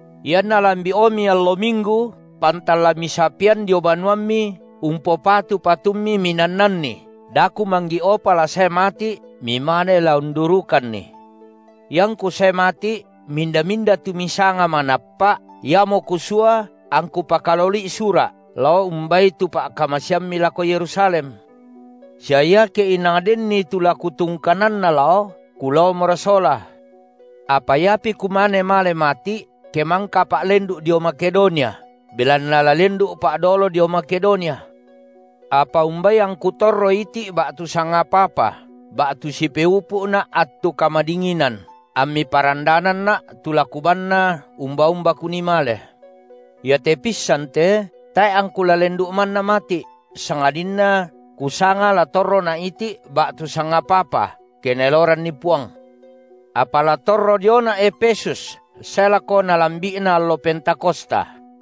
Ianna lambi’omi allo minggu pantan la misapean dio banuammi umpopatu patummi minannanni, da kumanggi’opa la sae mati’, mimane la undurukanni. Iangku sae mati’ minda-minda tu misanga manappa’, iamo kusua angku pakaloli’i sura’, lao umbai tu pa’kamaseammi lako Yerusalem. Sia iake inang denni tu la kutungkananna lao, kulaomora sola. Apa iapi kumane male mati’, ke mangkapa’ lendu’ dio Makedonia, belanna la lendu’pa’ dolo dio Makedonia. Apa umbai angku torro iti’ ba’tu sangapa-apa, ba’tu sipeupu’na’ attu kamadinginan, ammi parandananna’ tu la kubanna umba-umba kunii male. Iate pissan te tae’ angku la lendu’ manna mati’, sangadinna kusanga la torrona’ iti’ ba’tu sangapa-apa, ke NaeloranNi Puang. Apa la torro diona’ Efesus sae lako nalambi’na allo Pentakosta.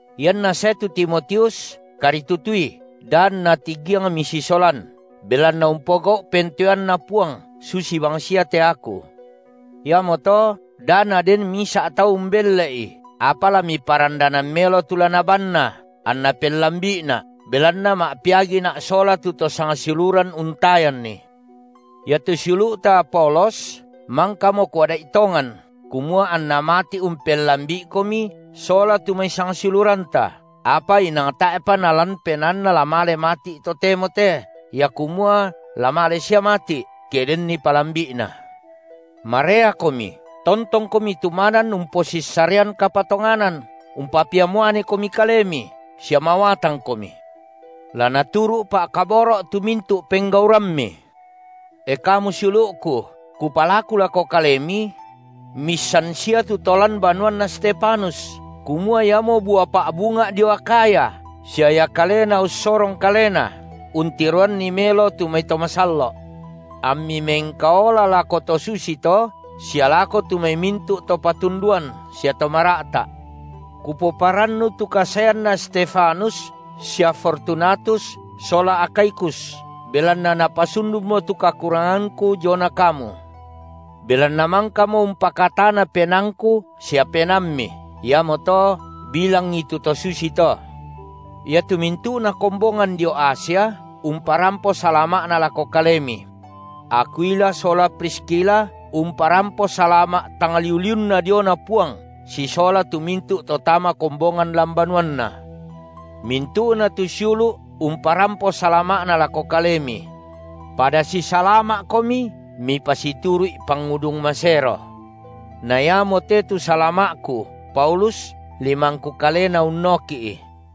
Ianna sae tu Timotius, karitutui, da anna tigiang misisolan, belanna umpogau’ pentoeanNa Puang, susi bangsia te aku. Iamoto da naden misa’ tau umbelle’i. Apa la miparandanan melo tu la nabanna, anna pellambi’ina’, belanna ma’peagina’ sola tu to sangsiuluran untayanni. Iatu siulu’ta Apolos, mangkamo kuada’i tongan, kumua anna mati’ umpellambi’ikomi sola tu mai sangsiuluranta, apa inang tae’pa nalan penaanna la male mati’ totemo te, ia kumua la male sia mati’, ke denni palambi’na. Mareakomi, tontongkomi tumanan umposissarean kapatonganan, umpapiamuanekomi kalemi, sia mawatangkomi. La naturu’ pa’kaboro’ tu mintu’ penggaurammi. E kamu siulu’ku, kupalaku lako kalemi: miissan sia tu to lan banuanna Stefanus, kumua iamo bua pa’bunga’ dio Akhaya, sia ia kalena ussorong kalena untiroanni melo tu mai to masallo’. Ammi mengkaola lako tu to susito sia lako tu mai mintu’ to patunduan sia to mara’ta’. Kupomarannu tu kasaeanna Stefanus sia Fortunatus sola Akhaikus, belanna napasundunmo tu kakurangangku diona kamu. Belanna mangkamo umpakatana penaangku sia penaammi. Iamoto bilangi tu to susito. Iatu mintu’na kombongan dio Asia umparampo salama’na lako kalemi. Akwila sola Priskila umparampo salama’ tang liu-liunna diona Puang sisola tu mintu’ to tama kombongan lan banuanna. Mintu’na tu siulu’ umparampo salama’na lako kalemi. Pada sisalama’komi mipasituru’i pangudung masero. Na iamote tu salama’ku, Paulus, limangku kalena unnoki’i.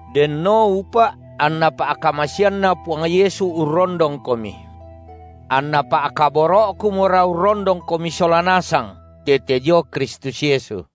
Denno upa’ anna pa’kamaseanNa Puang Yesu urrondongkomi. Anna pa’kaboro’kumora urrondongkomi sola nasang tete dio Kristus Yesu.